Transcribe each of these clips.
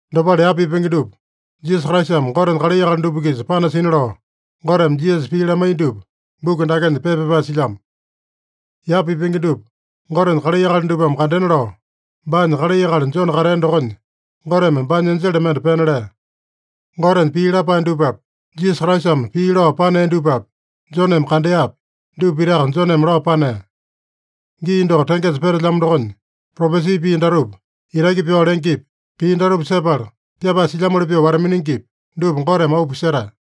Dopale yapa pipenge dupa Jisasa Kraisame Gotenya kalai akali dupa-kisa panasina lao, Goteme Jisasa pii lamaiya dupa buku dakenya pepa pyapae silyamo. Yapa pipenge dupa Gotenya kalai akali dupame kandena lao, baanya kalai akali Jone katea dokonya Goteme baanya enjele mende pena lea. Gotenya pii lapae dupapi, Jisasa Kraisame pii lao panea dupapi, Joneme kandeapi, dupa pitaka Joneme lao panea. Gii doko tengesa petelyamo dokonya, propesi pii datupa itaki pyao lengepi, pii datupa sepala pyapae silyamoli pyoo wata-miningipi, dupa Goteme auu pisetae.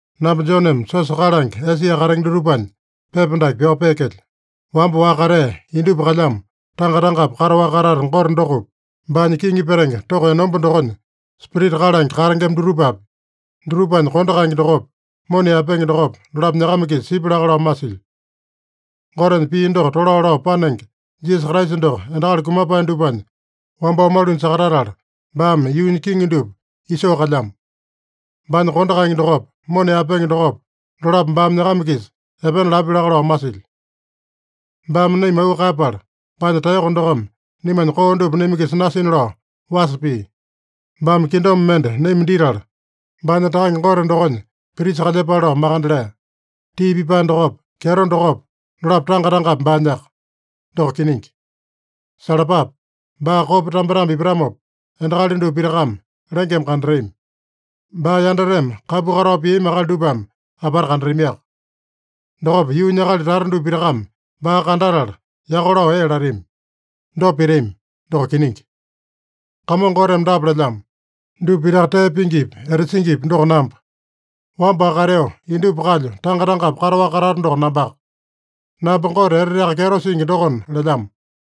Namba Joneme siosa kalange Esia katenge dutupanya pepa dake pyao peekelyo. Wamba-waka katea, indupa kalyamo, tanga-tangapi kataowaka katata Gote dokopi, baanya kiŋi petenge toko enomba dokonya Spirita kalange katengema dutupapi, dutupanya kondo kaenge dokopa, mona yaepenge dokopa, dolapo nyakama-kisa sipya laka lao masilyo. Gotenya pii doko tolao lao panenge Jisasa Kraisa doko endakali kumapae dupanya wambao malunya sakatatala, baame yuunya kiŋi dupa isoo kalyamo. Baanya kondo kaenge dokopa, mona yaepenge dokopa, dolapo baame nyakama-kisa epena lapya laka lao masilyo. Baame naima auu kaeyapala baanya taeyoko dokome naimanya koo dupa naima-kisa nasina lao wasa pia. Baame kingdom mende naima ditala, baanya Takange Gote dokonya prisa kalyepale lao makande lea. Tii pipae dokopa, kyeto dokopa, dolapo tanga-tangapi baanyaka. Doko kiningi. Salapape! Baa kopa tambetambe ipatamopa, endakali dupa pitakame lengeme kandatami. Baa yandateme kapu katao piami akali dupame apata kandatamiaka. Dokopa yuunya akali tata dupa pitakame baa kandatala yako lao ee latami. Dopa pitami. Doko kiningi. Kamongo Goteme dapa lelyamo: “Dupa pitaka tee pingipi, etasingipi doko namba. Wamba-waka kateo, indupa kalyo, tanga-tangapi kataowaka katato doko nambaka. Namba Gote Eteteaka Kyeto Singi dokona” lelyamo.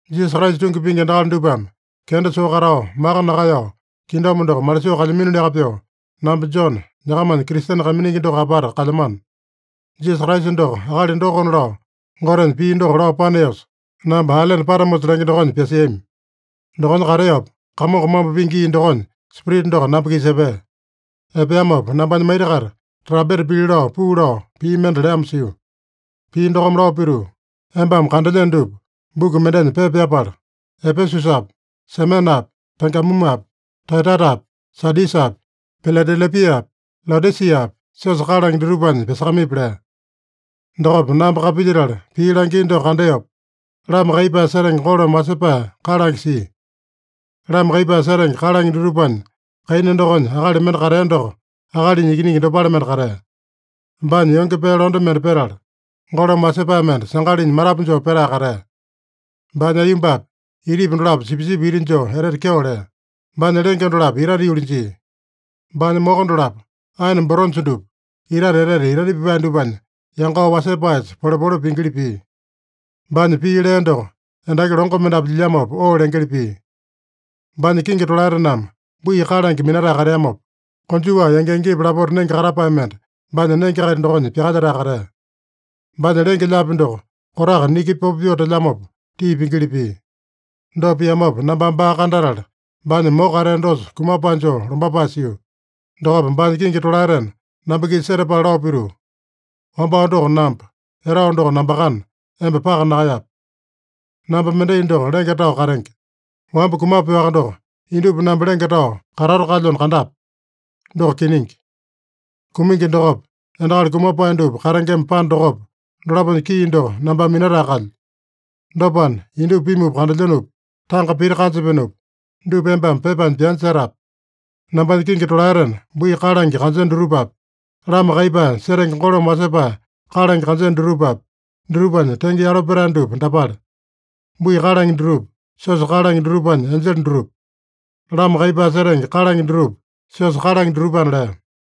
Jisasa Kraisa tungi pingi endakali dupame kenda soo katao, maka nakaeyao, kingdom doko malisoo kalyaminoliaka pyoo, namba Jone, nyakamanya Kristene kaiminingi doko apata kalyamano. Jisasa Kraisa doko akali dokona lao Gotenya pii doko lao paneosa, namba ailene Patamosa lenge dokonya pyasiami. Dokonya kateopa, Kamongo mambo pingi gii dokonya Spirita doko namba-kisa epea. Epeamopa nambanya maita-kaita trampeta pili lao puu lao pii mende leamo sio. Pii dokome lao pituu, “Embame kandelyeno dupa buku mendenya pepa pyapala, Epesusapi, Semenapi, Pegamumapi, Taeyataitapi, Sadisapi, Piladelepiapi, Laodisiapi, siosa kalange dutupanya pyasakamaipi” lea. Dokopa namba kapilyetala pii langia doko kandeopa, lama kaiyepae setenge golome wasepae kalange sia. Lama kaiyepae setenge kalange dutupanya kaina dokonya akali mende katea doko akalinya ikiningi dopale mende katea. Baanya yonge pee londe mende petala, golome wasepae mende sangalinya matapu joo petae katea. Baanya aiyombapa, itipa dolapo sipisipi iti joo etete kyeo lea. Baanya lenge dolapo itate yuli jia. Baanya moko dolapo aene boronja dupa itate etete itaita pipae dupanya yangao wasepaesa polepole pingili pia. Baanya pii lea doko endaki longo mendapu lyilyamopa oo lengeli pia. Baanya kingi tolaetename bui kalange minatae kateamopa, konjuwa yangi-yangipa lapota nenge katapae mende baanya nenge-kaita dokonya pyakalyetae katea. Baanya lenge-lyaapi doko kotaka niki popo pyoo telyamopa tii pingili pia. Dopa piamopa nambame baa kandatala, baanya moko katea dosa kumapae joo lombapae sio. Dokopa baanya kingi tolaetena namba-kisa setapala lao pituu, “Wambao doko namba, etao doko nambakana, emba paka nakaeyape. Namba mendai doko lenge tao katenge. Wamba kumapeowaka doko indupa namba lenge tao katato kalyona kandape. Doko kiningi. Kumingi dokopa, endakali kumapae dupa katengema panda dokopa, dolaponya kii doko nambame minatae kalyo. Dopana, indupa pimupa kandelyenopi, tanga pita kanjapenopi, dupa embame pepanya pyanya setape. Nambanya kingi tolaetena bui kalange kanjeno dutupapi, lama kaiyepae setenge golome wasepae kalange kanjeno dutupapi, dutupanya tenge yalo petae dupa dapale: Bui kalange dutupa, siosa kalange dutupanya enjele dutupa. Lama kaiyepae setenge kalange dutupa, siosa kalange dutupana” lea.